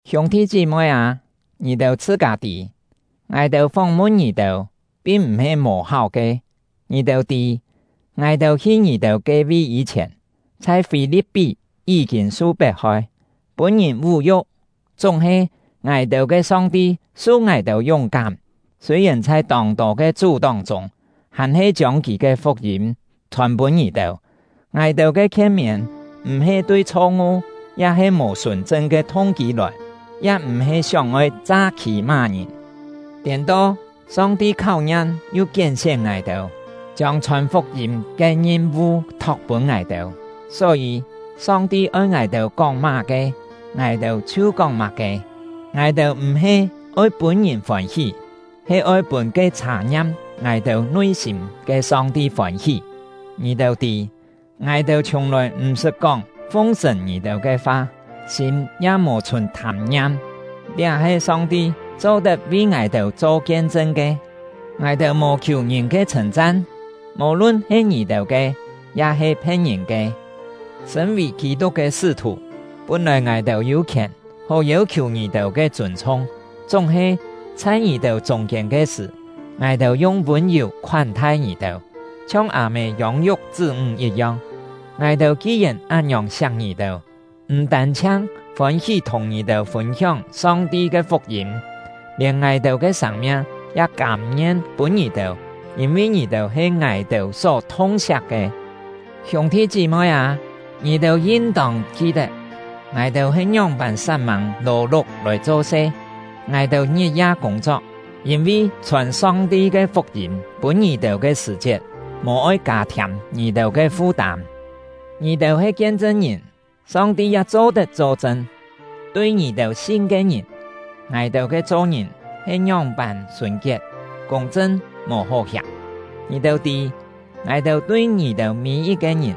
Hiûng-thi chí-moi â, ngì-têu chhṳ-kâ tî, ngài-têu fóng-mun ngì-têu pin m̀-he mò-háu ke. Ngì-têu tî, ngài-têu hi ngì-têu ke-vi yî-chhièn, chhai Fî-li̍p-pí yí-kîn su pet-hoi, pûn-ngìn vú-yu̍k. Chúng-he, ngài-têu ke Song-ti su ngài-têu yúng-kám, sûi-yèn chhai tông-tô ke chú-tóng chûng, hàn-he chiông Kì ke fuk-yîm chhòn-pûn ngì-têu. Ngài-têu ke khien-miên m̀-he tui chho-ngu ya-he mò sùn-chṳn ke thung-kî lòi, ya m̀-he sióng-oi cha-khî má-ngìn. Tiên-to, Song-ti kháu-ngiam yu kién-sién ngài-têu, chiông chhòn fuk-yîm ke ngim-vu thok pûn ngài-têu. Só-yî, Song-ti oi ngài-têu kóng má-ke, ngài-têu chhiu kóng má-ke. Ngài-têu m̀-he oi pûn ngìn fôn-hí, he oi pûn ke chhat-ngiam ngài-têu nui-sîm ke Song-ti fôn-hí. Ngì-têu tî, ngài-têu chhiùng-lòi m̀-sṳt kóng fung-sṳ̀n ngì-têu ke fa, sîm ya mò chhùn thâm-ngiam; liá he Song-ti cho-tet vi ngài-têu cho kien-chṳn ke. Ngài-têu mò khiù ngìn ke chhṳ̂n-chan, mò-lun he ngì-têu ke, ya-he phe̍t-ngìn ke. Sṳ̂n-vì Kî-tuk ke sṳ́-thù, pún-lòi ngài-têu yû khièn hó yêu-khiù ngì-têu ke chûn-chhung; chúng-he, chhai ngì-têu chûng-kiên ke sṳ̀, ngài-têu yung vûn-yù khoán-thai ngì-têu, chhiong â-mê yông-yuk chṳ́-ńg yit-yong. Ngài-têu ki-yèn án-ngiòng siak ngì-têu, m̀ tân-chhiang fôn-hí thùng ngì-têu fûn-hióng Song-ti ke fuk-yîm, lièn ngài-têu ke sâng-miang ya kâm-ngien pûn ngì-têu, yîn-vi ngì-têu he ngài-têu só thung-siak ke! Hiûng-thi chí-moi â, ngì-têu yin-tông ki-tet, ngài-têu he ngióng-pân sat-mâng lò-luk lòi cho-se; ngài-têu ngit-ya kûng-chok, yîn-vi chhòn Song-ti ke fuk-yîm pûn ngì-têu ke sṳ̀-chiet, mò-oi kâ-thiâm ngì-têu ke fu-tâm. Ngì-têu he kien-chṳn-ngìn, Song-ti ya cho-tet cho-chṳn: Tui ngì-têu sin ke ngìn, ngài-têu ke cho-ngìn he ngióng-pân sùn-kiet, kûng-chṳn, mò hó hiàm. Ngì-têu tî, ngài-têu tui ngì-têu mî-yit-ke ngìn,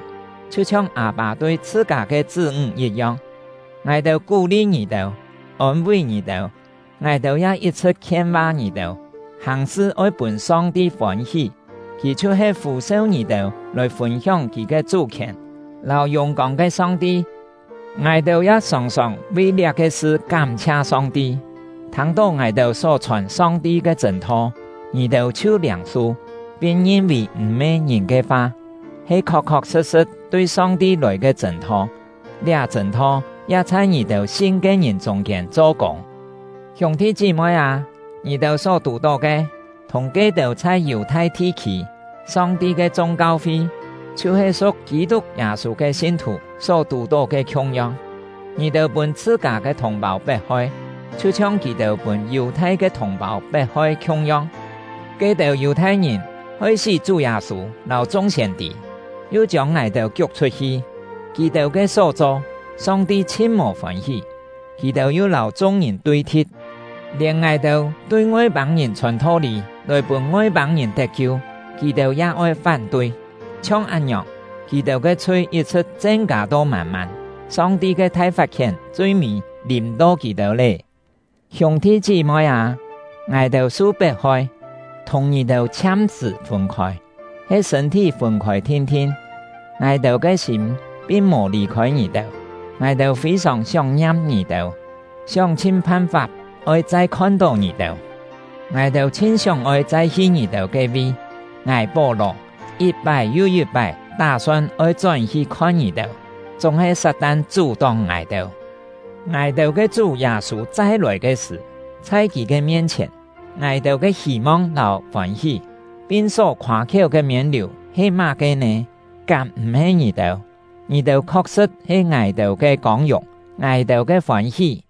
chhiu-chhiong â-pâ tui chhṳ-kâ ke chṳ́-ńg yit-yong: Ngài-têu kú-li ngì-têu, ôn-ví ngì-têu; ngài-têu ya yit-chhṳ̍t khien-va ngì-têu, hàng-sṳ oi pûn Song-ti fôn-hí; Kì chhiu-he fû-seu ngì-têu lòi fûn-hióng Kì ke chú-khièn lâu yùng-kông ke Song-ti. Ngài-têu ya sòng-sòng vi liá-ke sṳ kám-chhia Song-ti: Thâng-tó ngài-têu só chhòn Song-ti ke chṳ̂n-tho, ngì-têu chhiu liâng-su, pin ngin-vì m̀-he ngìn ke fa, he khok-khok sṳ̍t-sṳ̍t tui Song-ti lòi ke chṳ̂n-tho; liá chṳ̂n-tho “liá chṳ̂n-tho” ya-he yi̍t-cho “Song-ti”. ya chhai ngì-têu sin ke ngìn chûng-kiên cho kûng. Hiûng-thi chí-moi â, ngì-têu só tù-tó ke, thùng ke-têu chhai Yù-thai thi-khî, Song-ti ke chung kau-fi, chhiu-he su̍k Kî-tuk Yâ-sû ke sin-thù só tù-tó ke khiung-yong. Ngì-têu pûn chhṳ-kâ ke thùng-pâu pet-hoi, chhiu-chhiong kì-têu pûn Yù-thai ke thùng-pâu pet-hoi khiung-yong. Ke-têu Yù-thai-ngìn hoi-sí Chú Yâ-sû lâu chung siên-tî, yu chiông ngài-têu kiuk chhut-hi. Kì-têu ke só cho, Song-ti chhin mò fôn-hí. Kì-têu yu lâu chung-ngìn tui-thi̍t. Lièn ngài-têu tui Ngoi-pâng-ngìn chhòn tho-lî lòi pûn Ngoi-pâng-ngìn tet-kiu, kì-têu ya oi fán-tui. Chhiong án-ngiòng, kì-têu ke chhui yit-chhṳ̍t chen-kâ to mân-mân; Song-ti ke thai fat-khién chui-mî lìm-to kì-têu lé! Hiûng-thi chí-moi â, ngài-têu su pet-hoi, thùng ngì-têu chhiam-sṳ̀ fûn-khôi, he sṳ̂n-thí fûn-khôi thin-thin, ngài-têu ke sîm pin mò lì-khôi ngì-têu. Ngài-têu fî-sòng sióng-ngiam ngì-têu, sióng-chhin phan-fap oi chai khon-tó ngì-têu! Ngài-têu chhin sióng-oi chai hi ngì-têu ke-vi! Ngài — Pó-lò yit-pái yu yit-pái tá-son oi chón-hi khon ngì-têu, chúng-he Sat-tan chú-tóng ngài-têu. Ngài-têu ke Chú Yâ-sû chai-lòi ke sṳ̀, chhai kì ke mien-chhièn, ngài-têu ke hî-mong lâu fôn-hí, pin só khoâ-khiéu ke miên-liù he má-ke nè? Kám m̀-he ngì-têu? Ngì-têu khok-sṳ̍t he ngài-têu ke kông-yùng, ngài-têu ke fôn-hí!